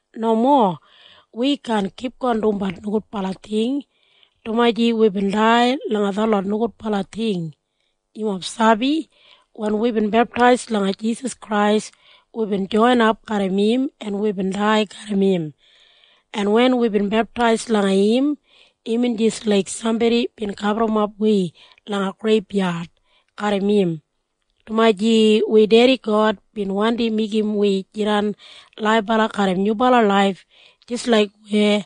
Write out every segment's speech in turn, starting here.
Nomo. Wi kaan kipgon dumbat nogudbala ting, dumaji wibin dai langa detlot nogudbala ting. Yumob sabi? Wen wibin beptais langa Jisas Krais, wibin joinap garram im en wibin dai garram im. En wen wibin beptais langa im, imbin jis laik sambodi bin gaburrumap wi langa greibyad garram im, dumaji wi Dedi God bin wandi meigim wi jidan laibala garram nyubala laif jis laik weya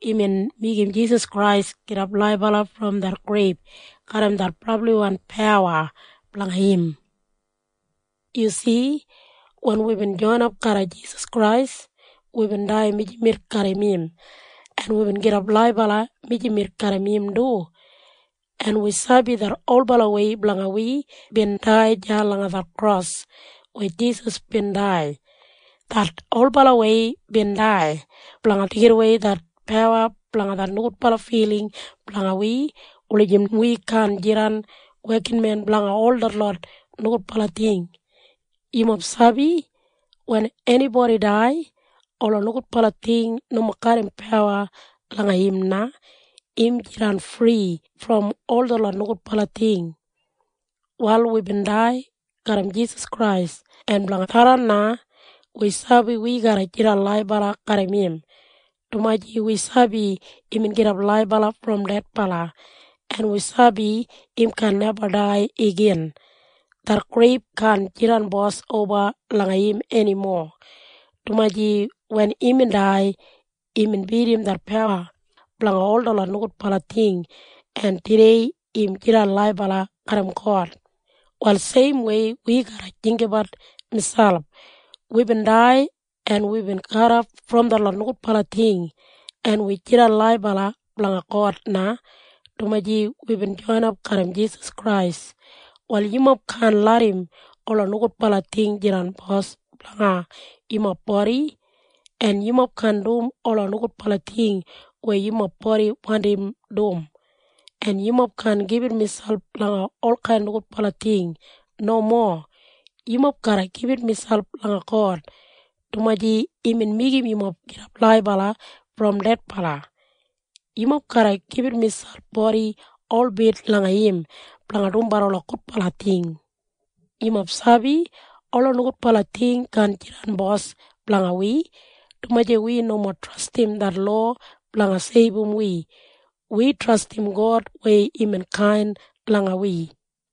imbin meigim Jisas Krais gidap laibala brom det greib garram det brabliwan pawa blanga im. Yu si? Wen wibin joinap garra Jisas Krais, wibin dai mijamet garram im, en wibin gidap laibala mijamet garram im du. En wi sabi det olbalawei blanga wi bin dai deya langa det kros weya Jisas bin dai. Det olbalawei bin dai blanga deigidawei det pawa blanga det nogudbala filing blanga wi wulijim wi kaan jidan wekinmen blanga ol detlot nogudbala ting. Yumob sabi? Wen enibodi dai, ola nogudbala ting nomo garram pawa langa im na. Im jidan fri brom ol detlot nogudbala ting. Wal wibin dai garram Jisas Krais, en blanga tharran na wi sabi wi garra jidan laibala garram im, dumaji wi sabi imbin gidap laibala brom dedbala, en wi sabi im kaan neba dai igin. Det greib kaan jidan bos oba langa im enimo, dumaji wen imbin dai, imbin bidim det pawa blanga ol detlot nogudbala ting, en tudei im jidan laibala garram God. Wal seimwei wi garra jinggabat miselp. Wibin dai, en wibin kadof brom detlot nogudbala ting, en wi jidan laibala blanga God na, dumaji wibin joinap garram Jisas Krais. Wal yumob kaan larram ola nogudbala ting jidan bos blanga yumob bodi, en yumob kaan dum ola nogudbala ting weya yumob bodi wandim dum, en yumob kaan gibit miselp langa olkain nogudbala ting. Nomo. Yumob garra gibit miselp langa God, dumaji imbin meigim yumob gidap laibala brom dedbala. Yumob garra gibit miselp bodi holbit langa im blanga dumbat ola gudbala ting. Yumob sabi? Ola nogudbala ting kaan jidan bos blanga wi, dumaji wi nomo trastim det lowa blanga seibum wi. Wi trastim God weya imbin kain langa wi.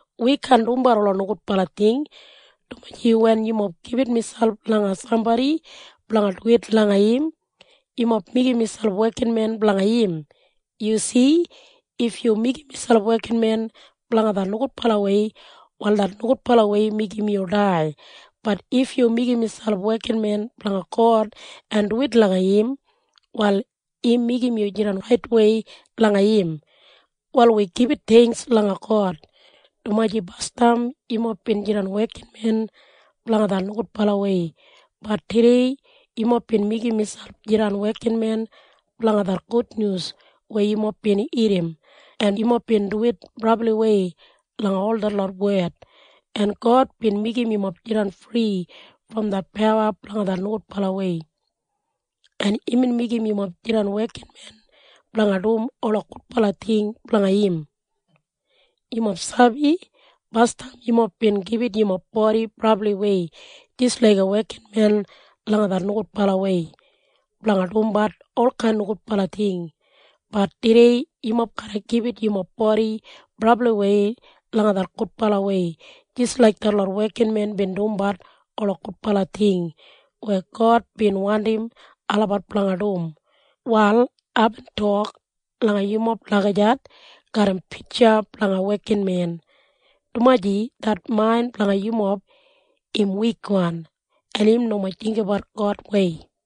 Wi kaan dumbat ola nogudbala ting, dumaji wen yumob gibit miselp langa sambodi blanga duwit langa im, yumob meigim miselp wekinmen blanga im. Yu si? If yu meigim miselp wekinmen blanga det nogudbalawei, wal det nogudbalawei meigim yu dai. Bat if yu meigim miselp wekinmen blanga God en duwit langa im, wal im meigim yu jidan raitwei langa im. Wal wi gibit theingks langa God, dumaji basdam yumob bin jidan wekinmen blanga det nogudbalawei, bat tudei yumob bin meigim miselp jidan wekinmen blanga det gudnyus weya yumob bin irrim, en yumob bin duwit brabliwei langa ol detlot wed, en God bin meigim yumob jidan fri brom det pawa blanga det nogudbalawei, en imbin meigim yumob jidan wekinmen blanga dum ola gudbala ting blanga im. Yumob sabi? Basdam yumob bin gibit yumob bodi brabliwei jis laiga wekinmen langa det nogudbalawei blanga dumbat olkain nogudbala ting. Bat tudei yumob garra gibit yumob bodi brabliwei langa det gudbalawei jis laik detlot wekinmen bin dumbat ola gudbala ting weya God bin wandim olabat blanga dum. Wal aibin tok langa yumob lagijat garram pitja blanga wekinmen, dumaji det main blanga yumob im wikwan en im nomo jinggabat Godwei.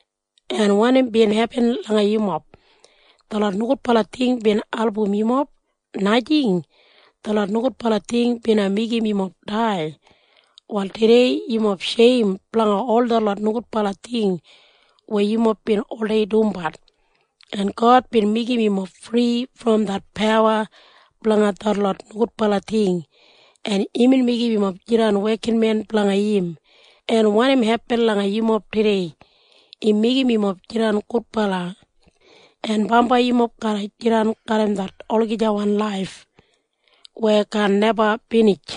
En wanim bin hepin langa yumob? Detlot nogudbala ting bin album yumob? Najing. Detlot nogudbala ting bina meigim yumob dai. Wal tudei yumob sheim blanga ol detlot nogudbala ting weya yumob bin oldei dumbat, en God bin meigim yumob fri brom det pawa blanga detlot nogudbala ting, en imbin meigim yumob jidan wekinmen blanga im. En wanim hepin langa yumob tudei? Im meigim yumob jidan gudbala, en bambai yumob garra jidan garram det olagijawan laif weya kaan neba binij.